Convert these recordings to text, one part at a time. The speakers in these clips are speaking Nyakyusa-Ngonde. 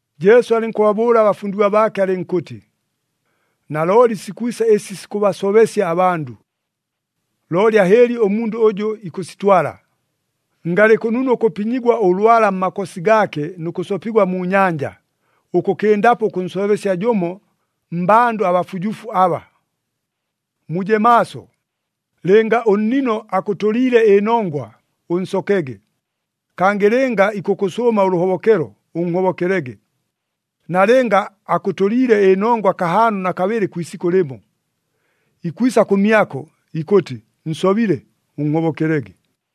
Jesu alɨnkʉbabʉʉla abafundigwa baake alɨnkʉtɨ, “Nalooli sikwisa ɨsi sikʉbasobesya abandʉ! Looli ahɨɨli ʉmundʉ ʉjʉ ikʉsitwala! Ngalɨ kʉnunu ʉkʉpinyigwa ʉlwala mmakosi gaake nʉ kʉsopigwa mu nyanja, ʉkʉkɨndapo ʉkʉnsobesya jʉmo mmbandʉ abafujufu aba! Muje maaso! Lɨnga ʉnnino akʉtʉliile ɨnongwa, ʉnsokege. Kangɨ lɨnga ikʉkʉsʉʉma ʉlʉhobokelo, ʉnhobokelege. Nalɨnga akʉtʉliile ɨnongwa kahaano na kabɨlɨ kwi isikʉ lɨmo, ikwisa kʉmyako, ikʉtɨ, ‘Nsobile,’ ʉnhobokelege!”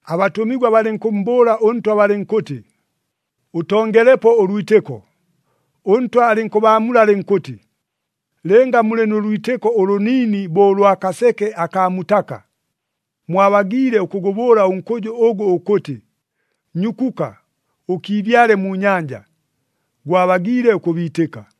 Abatʉmigwa balɨnkʉmmbʉʉla ʉNtwa balɨnkʉtɨ, “Ʉtongelepo ʉlwitɨko!” ɄNtwa alɨnkʉbaamula alɨnkʉtɨ, “Lɨnga mulɨ nʉ lwitɨko ʉlʉniini bo ʉlwa kaseke akaa mutaka, mwabagiile ʉkʉgʉbʉʉla ʉnkʉjʉ ʉgʉ ʉkʉtɨ, ‘Nyukuka, ʉkiibyale mu nyanja,’ gwabagiile ʉkʉbiitɨka.”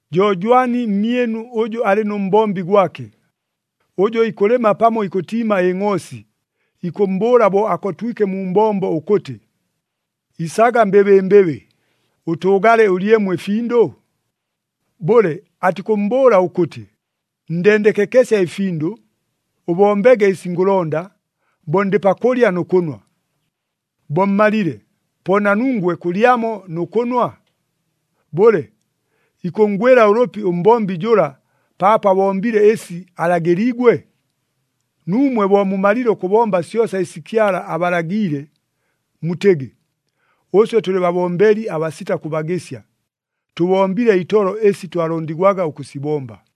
“Jo jwani mmyɨnu ʉjʉ alɨ nʉ mbombi gwake, ʉjʉ ikʉlɨma pamo ikʉtiima ɨngʼoosi, ikʉmmbʉʉla bo akotwike mu mbombo ʉkʉtɨ, ‘Isaga mbɨbɨmbɨbɨ, ʉtʉʉgale, ʉlyemo ɨfindʉ’? Bʉle, atikʉmmbʉʉla ʉkʉtɨ, ‘Ndendekekesya ɨfindʉ, ʉbombege ɨsi ngʉlonda, bo ndɨ pakʉlya nʉ kʉnwa. Bo mmalile, po na nungwe kʉlyamo nʉ kʉnwa’? Bʉle, ikʉnngwɨla ʉlʉpi ʉmbombi jʉla, paapo abombile ɨsi alagɨliigwe? Nuumwe bo mumalile ʉkʉbomba syosa ɨsi Kyala abalagiile, mutɨgɨ, ‘Ʉswe tʉlɨ babombeli abasita kʉbagɨsya, tʉbombile itolo ɨsi twalondigwaga ʉkʉsibomba.’”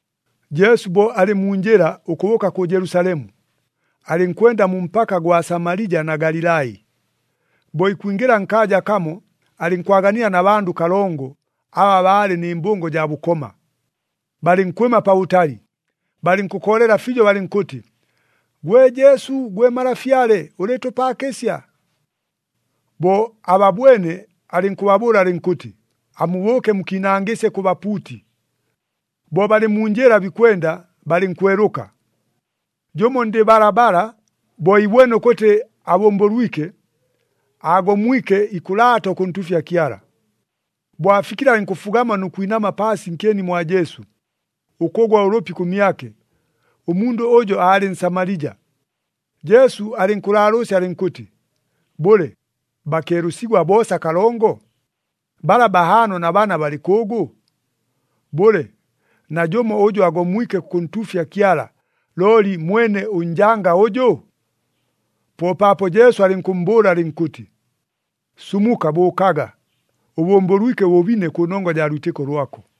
Jesu bo alɨ mu njɨla ʉkʉbʉʉka kʉ Jelusalemu, alɨnkwenda mu mpaka gwa Samalija na Galilai. Bo ikwingɨla nkaaja kamo, alɨnkwaganila na bandʉ kalongo, aba baalɨ nɨ mbʉngo jaa bʉkoma. Balɨnkwɨma pabʉtali, balɨnkʉkoolela fiijo balɨnkʉtɨ, “Gwe Jesu gwe Malafyale, ʉlɨɨtʉpaakɨsya!” Bo ababwene alɨnkʉbabʉʉla alɨnkʉtɨ, “Amubʉʉke mukiinangɨsye kʉ bapuuti.” Bo balɨ mu njɨla bikwenda, balɨnkwelʉka. Jʉmo ndɨ balabala, bo iibwene ʉkʉtɨ abʉmbʉlwike, aagomwike ikʉlaata ʉkʉntuufya Kyala. Bo afikile alɨnkʉfugama nʉ kwinama paasi nkyeni mwa Jesu, ʉkʉgwa ʉlʉpi kʉmyake. Ʉmundʉ ʉjo aalɨ Nsamalija. Jesu alɨnkʉlaalʉʉsya alɨnkʉtɨ, “Bʉle, bakeelʉsigwa boosa kalongo? Bala bahaano na bana balɨ kʉʉgʉ? Bʉle, najʉmo ʉjʉ agomwike kʉkʉntuufya Kyala, looli mwene ʉnjanga ʉjʉ?” Po paapo Jesu alɨnkʉmmbʉʉla alɨnkʉtɨ, “Sumuka, bʉʉkaga, ʉbʉmbʉlwike ʉbʉbine kʉnongwa jaa lwitɨko lwako!”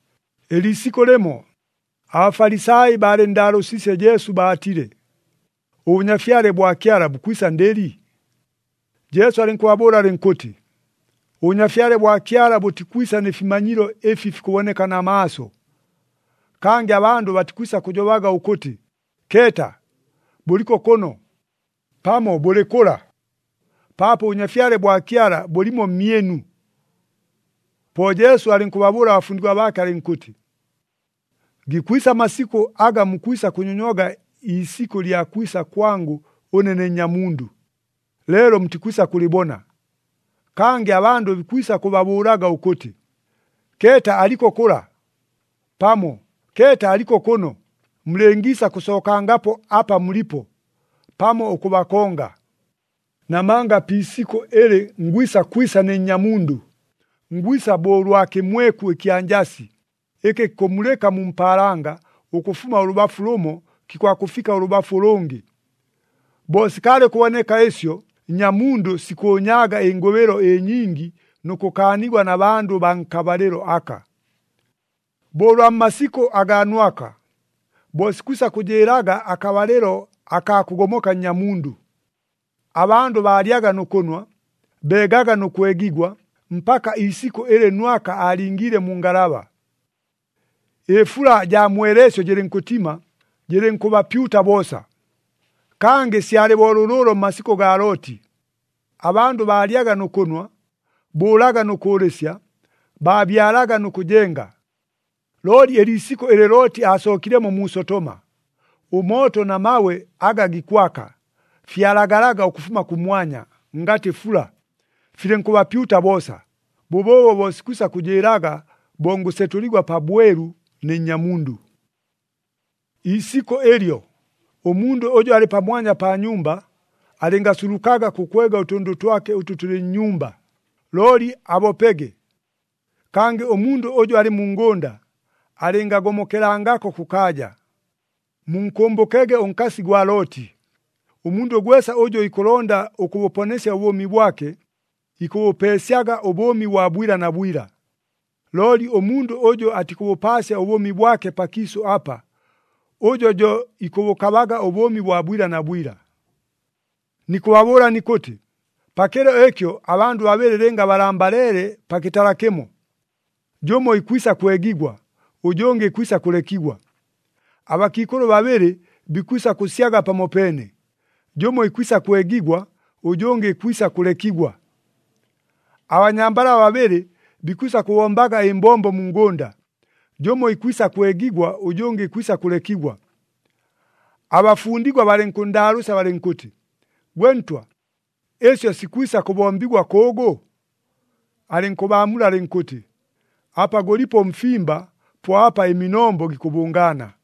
Ɨliisikʉ lɨmo, aBafalisai baalɨnndaalʉʉsiisye Jesu baatile, “ɄBʉnyafyale bwa Kyala bukwisa ndɨli?” Jesu alɨnkʉbaamula alɨnkʉtɨ, “ɄBʉnyafyale bwa Kyala bʉtikwisa nɨ fimanyilo ɨfi fikʉboneka na maaso. Kangɨ abandʉ batikwisa kʉjobaga ʉkʉtɨ, ‘Keeta! Bʉliko kʉno!’ pamo, ‘Bʉlɨ kʉla!’ Paapo ʉBʉnyafyale bwa Kyala bʉlimo mmyɨnu.” Po Jesu alɨnkʉbabʉʉla abafundigwa baake alɨnkʉtɨ, “Gikwisa amasikʉ aga mukwisa kʉnyonywaga iisikʉ lya kwisa kwangʉ ʉne ne Nnyamundʉ, leelo mutikwisa kʉlɨbona. Kangɨ abandʉ bikwisa kʉbabʉʉlaga ʉkʉtɨ, ‘Keeta aliko kʉla!’ pamo, ‘Keeta aliko kʉno!’ Mulɨngiisa kʉsookangapo apa mulipo, pamo ʉkʉbakonga. Namanga pi isikʉ ɨlɨ ngwisa kwisa ne Nnyamundʉ, ngwisa bo ʉlwa kɨmweku ɨkya njasi, ɨkɨ kikʉmulɨka mu mpaalanga, ʉkʉfuma ʉlʉbafu lʉmo kikwakʉfika ʉlʉbafu ʉlʉngɨ. Bo sikaalɨ ʉkʉboneka ɨsyo, Nnyamundʉ sikʉʉnyaaga ɨngʉbɨlo ɨnyingi nʉ kʉkaanigwa na bandʉ baa nkabalɨlo aka. “Bo ʉlwa mmasikʉ agaa Nwaka, bo sikwisa kʉjɨɨlaga akabalɨlo akaa kʉgomoka Nnyamundʉ. Abandʉ baalyaga nʉ kʉnwa, beegaga nʉ kwegigwa, mpaka iisikʉ ɨlɨ Nwaka aalingiile mu ngalaba. Ɨfula jaa mweleesyo jɨlɨnkʉtima, jɨlɨnkʉbapyuta boosa. “Kangɨ syalɨ bo lʉlʉʉlo mmasikʉ gaa Looti. Abandʉ baalyaga nʉ kʉnwa, bʉʉlaga nʉ kʉʉlɨsya, baabyalaga nʉ kʉjenga. Looli ɨliisikʉ ɨlɨ Looti aasookilemo mu Sotoma, ʉmooto na mabwe aga gikwaka, fyalagalaga ʉkʉfuma kʉmwanya, ngatɨ fula, filɨnkʉbapyuta boosa. Bʉbʉʉbo bo sikwisa kʉjɨɨlaga, bo ngʉsetʉligwa pabwelu ne Nnyamundʉ. “Iisikʉ ɨlyo, ʉmundʉ ʉjʉ alɨ pamwanya pa nyumba, alɨngasulukaga kʉkwega ʉtʉndʉ twake ʉtʉ tʉlɨ nnyumba, looli abopege. Kangɨ ʉmundʉ ʉjʉ alɨ mu ngʉnda, alɨngagomokelangako kʉkaaja. Munkʉmbʉkege ʉnkasi gwa Looti! Ʉmundʉ gwesa ʉjʉ ikʉlonda ʉkʉbʉponesya ʉbʉʉmi bwake, ikʉbʉpeesyaga ʉbʉʉmi bwa bwila na bwila. Looli ʉmundʉ ʉjʉ atikʉbʉpaasya ʉbʉʉmi bwake pakiisʉ apa, ʉjo jo ikʉbʉkabaga ʉbʉʉmi bwa bwila na bwila. “Nikʉbabʉʉla nikʉtɨ, pakɨlo ɨkyo abandʉ babɨlɨ lɨnga balambaleele pa kɨtala kɨmo, jʉmo ikwisa kwegigwa, ʉjʉngɨ ikwisa kʉlekigwa. Abakiikʉlʉ babɨlɨ bikwisa kʉsyaga pamopeene, jʉmo ikwisa kwegigwa, ʉjʉngɨ ikwisa kʉlekigwa. [ Abanyambala babɨlɨ bikwisa kʉbombaga ɨmbombo mu ngʉnda, jʉmo ikwisa kwegigwa, ʉjʉngɨ ikwisa kʉlekigwa.]” Abafundigwa balɨnkʉnndaalʉʉsya balɨnkʉtɨ, “Gwe Ntwa, ɨsyo sikwisa kʉbombigwa kʉʉgʉ?” Alɨnkʉbaamula alɨnkʉtɨ, “Apa gʉlipo ʉmfimba, po apa ɨminombo gikʉbʉngaana.”